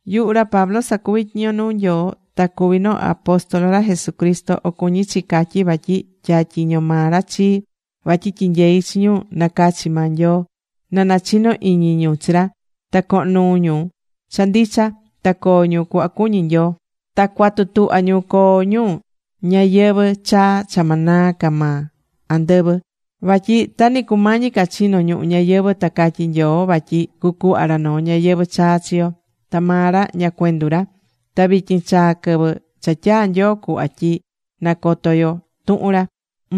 Yuhu ra Pablo sacuví tyiño nuu Nyoo. Ta cuví noo apóstol ra Jesucristo, o cuñí chi catyi vatyi tyatyiño maa ra chii vatyi tyinyei chi ñu nacachi̱ maa Nyoo, na nachino iñi ñu chi ra, ta cohon nuu ñu cha ndicha, ta coo ñu cuhva cuñí Nyoo. Ta cua̱tu tuhva ñu coo ñu ñayɨvɨ̱ chaa cha ma naa ca maa andɨvɨ. Vatyi ta nɨ cumañi ca chino ñuhu ñayɨvɨ̱ ta catyi̱ Nyoo vatyi cucuhva ra noo ñayɨvɨ̱ chaa chi yo. Ta maa ra ña cuendu ra. Ta vityin chaa̱ quɨvɨ cha tyaa̱ Nyoo cuhva tyi nacoto yo tuhun ra.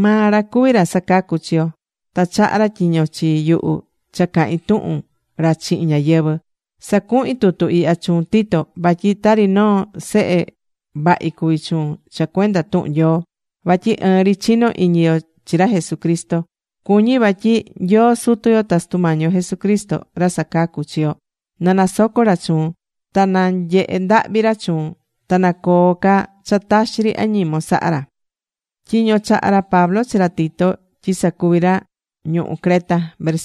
Maa ra cuví ra sacacú chi yo, ta chaha̱ ra tyiño chi yuhu cha cahin tuhun ra chihin ñáyɨvɨ. Sacuhín tutu ihya chuun, Tito, vatyi tari noo sehe vahi cuví chuun cha cuenda tuhun Nyoo, vatyi ɨɨn ri chinó iñi yo chi ra Jesucristo. Cuñí vatyi Nyoo Sutu yo ta Sutu Mañi yo Jesucristo, ra sacacú chi yo, na nasoco ra chuun, ta na nyehe ndahvi ra chuun, ta na coo ca cha taxi ri añimon sahá ra.Tyiño chaha̱ ra Pablo chi ra Tito tyi sacuvi ra ñuhu Creta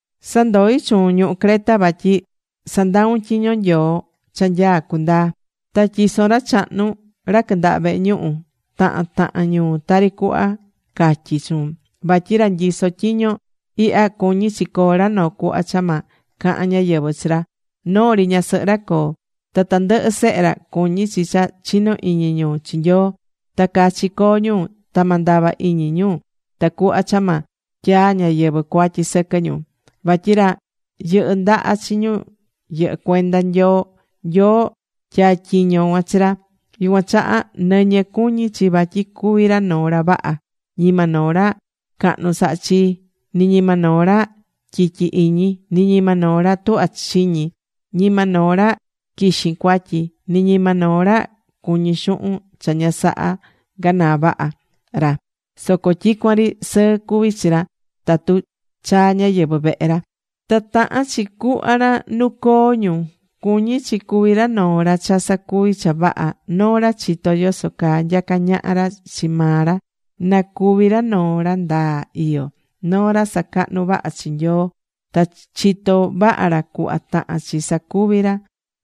Sandoi̱ chuun ñuhu Creta vatyi sa̱ndaun tyiño Nyoo cha nyaá cundaa. Ta tyi̱son ra chahnu ra quɨndaha vehe ñuhu tahan tahan ñuu tari cuhva catyi̱ chuun. Vatyi ra nyisó tyiño ihya cuñí chi coo ra noo cuhva cha ma cahan ñáyɨvɨ chi ra. Noo ri ñasɨhɨ ra coo. Ta tandɨhɨ sehe ra cuñí chi cha chinó iñi ñu chi Nyoo, ta cachi coo ñu ta ma ndava iñi ñu tacuhva cha ma tyaa ñáyɨvɨ cuatyi sɨquɨ ñu. Vatyi ra yɨndahá chi ñu yɨhɨ́ cuenda Nyoo, Nyoo tyatyiño̱ cuan chi ra. Yucuan chaha nɨñɨ cuñí chi vatyi cuví ra noo ra vaha. Ñima noo ra cahnu sahá chii, ni ñima noo ra tyityi iñi, ni ñima noo ra tuhvá chiñi. Ñima noo ra quixin cuatyi, ni ñima noo ra cuñí xuhun cha ña saha ganaa vaha ra. Soco tyicuan ri sɨɨ cuví chi ra tatu chaa ñáyɨvɨ vehe ra. Ta tahan chi cu̱hva ra nu coo ñu. Cuñí chi cuvi ra noo ra cha sacuví cha vaha. Noo ra chitó yoso caa nyaca ñaha ra chi maa ra. Na cuvi ra noo ra ndaa iyó, noo ra sacahnú vaha chi Nyoo. Ta chitó vaha ra cuhva tahán chi sacuvi ra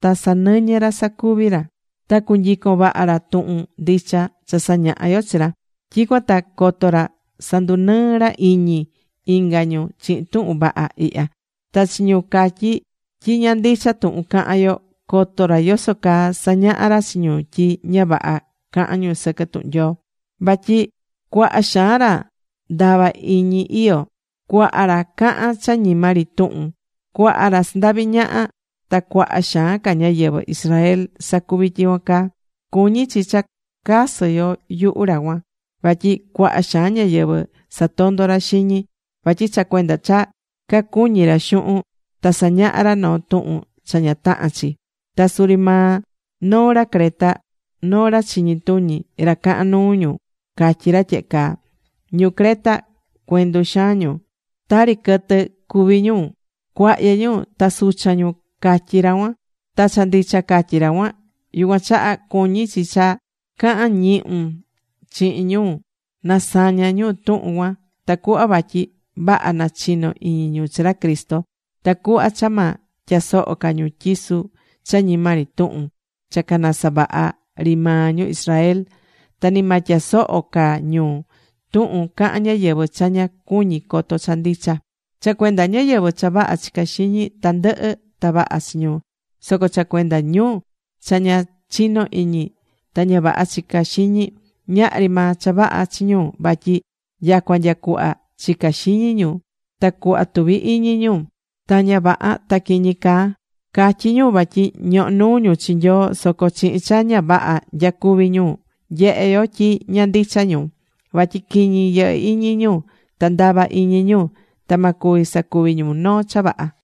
ta sa̱nɨñɨ ra sacuvi ra. Ta cu̱nyicon vaha ra tuhun ndicha cha sañahá yo chi ra. Tyicuan ta coto ra sandunɨɨ ra iñi inga ñu chihin tuhun vaha ihya. Ta chi ñu catyí tyi ña ndicha tuhun cahan yo, coto ra yoso caa sañaha ra chi ñu tyi ña vaha cahán ñu sɨquɨ tuhun Nyoo. Vatyi cuaha xaan ra ndava iñi iyó. Cuaha ra cahán cha ñima ri tuhun, cuaha ra sandaví ñaha. Ta cuaha xaan ca ñáyɨvɨ Israel sacuví tyicuan caa. Cuñí chi cha casɨ yo yuhu ra cuan, vatyi cuaha xaan ñáyɨvɨ satondó ra xiñi. Vatyi cha cuenda cha cacuñí ra xuhun ta sañahá ra noo tuhun cha ña tahán chi. Ta suri maa noo ra Creta, noo ra chiñi tuñi, ra cahán nuu ñu catyí ra tyehe caa: “Ñu Creta, cuendu xaan ñu. Tari quɨtɨ cuví ñu. Cuahyɨ ñu ta suchan ñu”, catyí ra cuan. Ta cha ndicha catyi̱ ra cuan. Yucuan chaha cuñí chi cha ca̱han ñihun chihin ñu na saña ñu tuhun cuan, tacuhva vatyi vaha na chino iñi ñu chi ra Cristo. Tacuhva cha ma tyasoho ca ñu tyisu cha ñima ri tuhun cha canasavaha̱ ri maa ñu Israel. Ta ni ma tyasoho ca ñu tuhun cahán ñáyɨvɨ cha ña cuñí coto cha ndicha. Cha cuenda ñáyɨvɨ cha vaha chicá xiñi, tandɨhɨ ta vaha chi ñu. Soco cha cuenda ñu cha ña chinó iñi ta ña vaha chica xiñi, ñahri maa cha vaha chi ñu vatyi nyacua nya cuhva chicá xiñi ñu ta cuhva tuví iñi ñu ta ña vaha ta quiñi caa. Catyí ñu vatyi ñohó nuu ñu chi Nyoo, soco chihin cha ña vaha nyacuví ñu nyehé yo tyi ña ndicha ñu. Vatyi quiñi yɨhɨ́ iñi ñu ta ndava iñi ñu. Ta ma cuvi sacuvi ñu noo cha vaha.